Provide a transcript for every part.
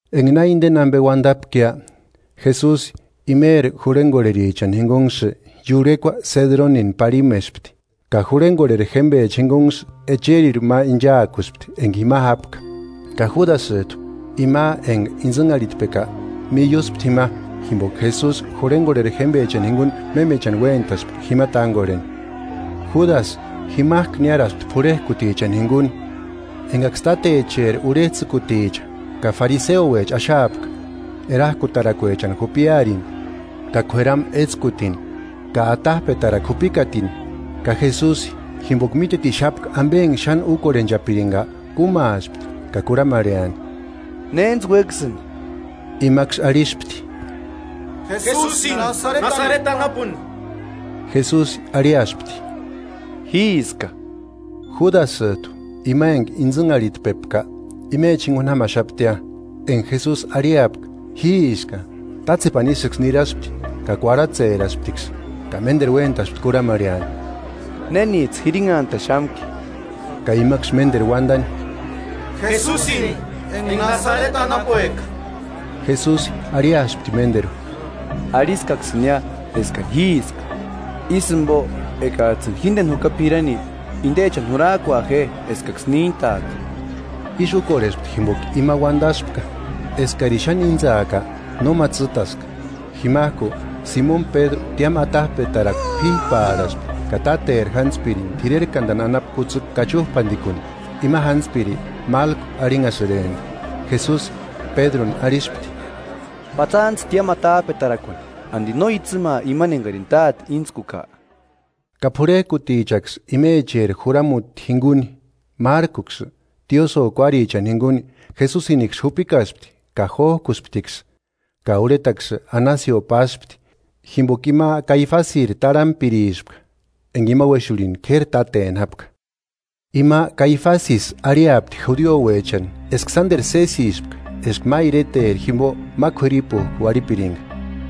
Enga na indeni ambe uandapkia, Jesusi imeri jurhengorherichani jingunksï iurhekua Sedronini parhimespti, ka jurhengorheri jémbecha jingunksï echerirhu ma inchaakuspti enga jima jápka. Ka Júdasïjtu, ima enga intsïnharhitpeka, miuspti jima, jimboka Jesusi jurhengorheri jémbechani jinguni mémechani uéntaspka jima tángorheni. Júdasï jimajku niáraspti p'urhejkutichani jinguni, engaksï tátecheri urhejtsïkuticha ka fariseouecha axaapka, erajkutarakuechani jupiarini ka k'ueramu étskutini ka atajpetarakua jupikatini. Ka Jesusi, jimboka mítetixapka ambe enga xáni úkorhenchapiringa, kúmaaspti ka kurhamarheani: –¿Néntsï uéksïni? Imaksï arhispti: –Jesusini Nasareti anapuni. Jesusi arhiaspti: –Jíska. Júdasïjtu, ima enga intsïnharhitpeka, imecha jinguni jámaxaptia. Enga Jesusi arhiapka: “Jíska” tátsepani ísïksï niraspti ka kuarhatserasptiksï. Ka ménderu uéntaspti kurhamarheani: –¿Nénijtsï jirinhantaxamki? Ka imaksï ménderu uandani: –Jesusini enga Nasareti anapueka. Jesusi arhiaspti ménderu: –Arhiskaksïnia eskani jíska. Ísï jimbo ekajtsïni jíndeni juka p'irani, indechani jurajkua je eskaksï níntaaka. Ísï úkorhespti jimboka ima uándaspka: “Eskarini xáni íntsaaka, nóma tsîtaska.” Jimajku Simoni Pédru tiámu atajpetarakua p'íjpaarhaspti ka táteri jántspirini t'irerkandani anapu kutsïkua kachujpandikuni. Ima jántspiri Málko arhinhasïrempti. Jesusi Pédruni arhispti: –Patsantsï tiámu atajpetarakuani. ¿Andi no itsïmaa imani engarini Táte intskuka? Ka p'urhejkutichaksï imecheri juramuti jinguni márkuksï, tiosïo kuárichani jinguni, Jesusiniksï jupikaspti ka jójkusptiksï. Ka urhetaksï Anasio páspti, jimboka ima Kaifasiri tarhampirispka, enga ima uéxurhini k'éri táteni jápka. Ima Caifasïsï arhiapti judiouechani eska sánderu sésispka eska ma ireteri jimbo ma k'uiripujku uarhipiringa.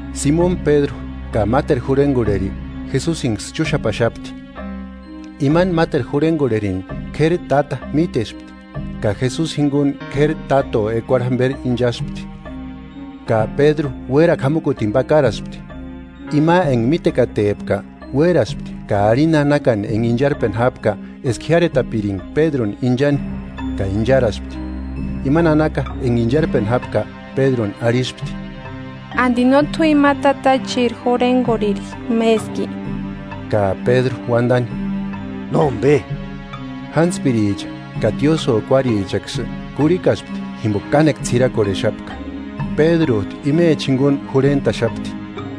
Simoni Pédru ka máteru jurhengorheri, Jesusinksï chúxapaxapti. Imani máteru jurhengorherini, k'éri táta mítespti, ka Jesusi jinguni k'éri táto ekuarhu jamberi inchaspti, ka Pédru uérakua jamukutini pakaraspti. Ima enga mítekatepka, uéraspti ka arhini nanakani enga incharpeni jápka eska jiáretapiringa Pédruni inchani, ka incharaspti. Ima nanaka enga incharpeni jápka Pédruni ahispti: –¿Andi no t'u ima tatachiri jurhengorheri méski? Ka Pédru uandani: –Nómbe. Jántspiricha ka tiósïo kuárichaksï kurhikaspti jimboka kánekua ts'irakorhexapka, Pédrujtu imecha jinguni jurhentaxapti.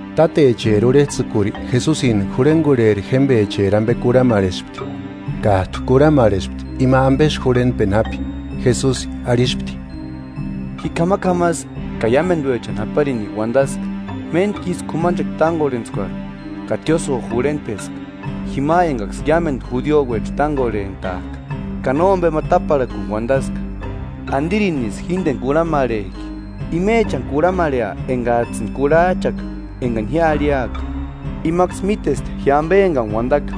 Tátecheri urhejtsïkuri Jesusini jurhengorheri jémbecheri ambe kurhamarhespti, kájtu kurhamarhespti ima ambesï jurhentpeni jápi. Jesusi arhispti: –Ji k'amak'amasï ka iámenduechani japarini uandaska; méntkisï k'umanchekua tángorhentskuarhu ka tiósïo jurhentpeska, jima engaksï iámendu judiouecha tángorhentajka, ka nómbema táparhakuni uandaska. ¿Andirinisï jíndeni kurhamarhejki? Imechani kurhamarhea engajtsïni kurhajchaka engani arhiaka; imaksï mítesti ji ambe engani uandaka.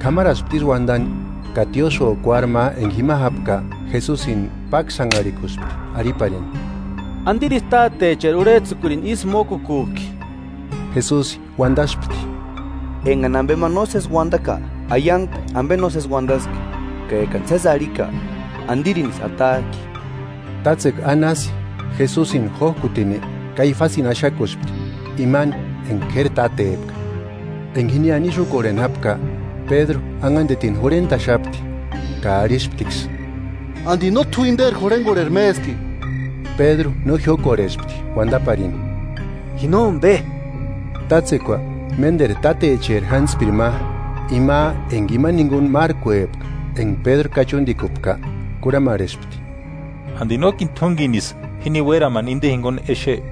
K'amaraspti ísï uandani ka tiósïo kuári ma enga jima jápka Jesusini páksanharhikuspti arhiparini: –¿Andirisï tátecheri urhejtsïkurini ísï mókukujki? Jesusi uandaspti: –Engani ambe ma nósesi uandaka, aiangpe ambe nósesi uandaski; ka ekani sési arhika, ¿Andirinisï atajki? Tátsekua Anasi Jesusini jójkutini Kaifasini axakuspti, imani enga k'éri tátepka. Enga jiniani ísï úkorheni jápka, Pédru anhandetini jurhentaxapti, ka arhisptiksï: –¿Andi no t'u inderi jurhengorheri méski? Pédru no jiókorhespti uandaparini: –Ji nómbe. Tátsekua ménderu tátecheri jántspiri ma, ima enga imani jinguni márkuepka enga Pédru kachundikupka, kurhamarhespti: –¿Andi nókini t'úngenisï jini uéramani inde jinguni exe?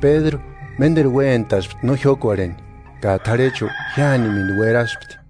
Pédru ménderu uéntaspti no jiókorheni, ka t'arhechu jiánimendu ueraspti.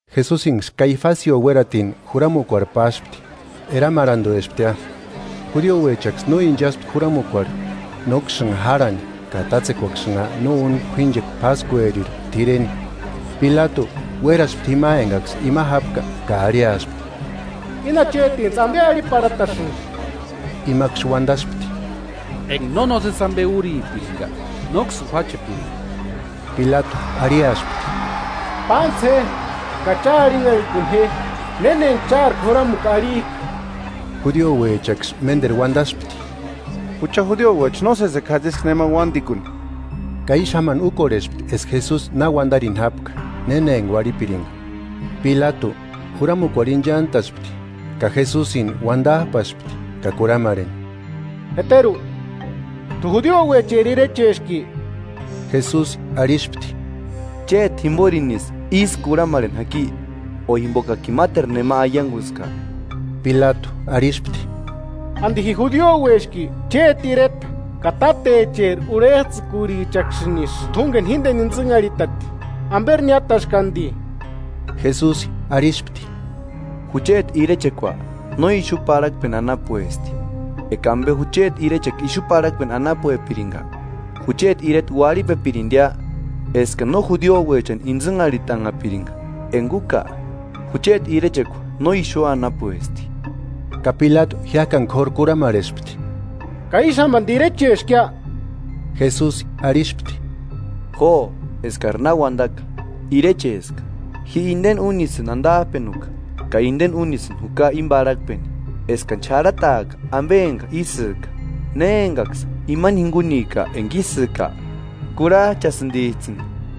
Jesusinksï Kaifasio uératini juramukuarhu páspti. Eramarhanduesptia. Judiouechaksï no inchaspti juramukuarhu, nóksïnha járhani ka tátsekuaksïnha no úni k'uínchekua páskueri t'ireni. Pilatu uéraspti jima engaksï ima jápka ka arhiaspti: –¿Íni achetintsï ambe arhiparhatasïnki? Imaksï uandaspti: –Enga no nósesi ambe úripiringa, nóksïni juáchepiringa. Pilatu arhiaspti: –Pántsï je ka cha arhinharhikuni je néna enga chári juramukua arhijka. Judiouechaksï ménderu uandaspti: –Jucha judiouecha no sésekua jatsiska némani uándikuni. Ka ísï jámani úkorhespti eska Jesusi na uandarini jápka néna enga uarhipiringa. Pilatu juramukuarhu inchantaspti ka Jesusini uandajpaspti ka kurhamarheni: –¿Jeteru t'u judiouecheri irecheski? Jesusi arhispti: –Chéti jimborinisï ísï kurhamarheni jaki, o jimbokakini máteru nema aianguska. Pilatu arhispti: –¿Andi ji judioueski? Chéti ireta ka tátecheri urhejtsïkurichaksïnisï t'úngeni jíndeni intsïnharhitati. ¿Amberi niátaski andi? Jesusi arhispti: –Jucheti irechekua no ixu parhakpeni anapuesti. Eka ambe jucheti irechekua ixu parhakpeni anapuepiringa, jucheti ireta uarhipepirindia eskani no judiouechani intsïnharhitanhapiringa: Enga úka, jucheti irechekua no ixu anapuesti. Ka Pilatu jiájkani k'óru kurhamarhespti: –¿Ka ísï jámaniri irecheskia? Jesusi arhispti: Jo eskari na uandaka, Irecheska. Ji indeni únisïni andajpenuka ka indeni únisïni juka íni parhakpeni: Eskani xarhataaka ambe enga ísïka. Ne engaksï imani jingunika enga ísïka, kurhajchasïndijtsïni.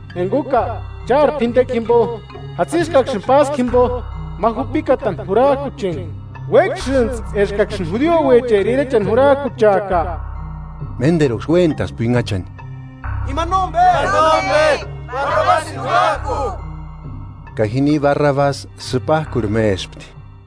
Eka úka, chári p'indekua jimbo, jatsiskaksïni páskua jimbo ma jupikatani jurajkucheni: ¿Uéksïntsï eskaksïni judiouecheri irechani jurajkucheaka? Ménderuksï uéntaspti uinhachani: –¡Imani nómbe! ¡Barrabasini jurajku! Ka jini Barrabasi sïpajkurha mespti.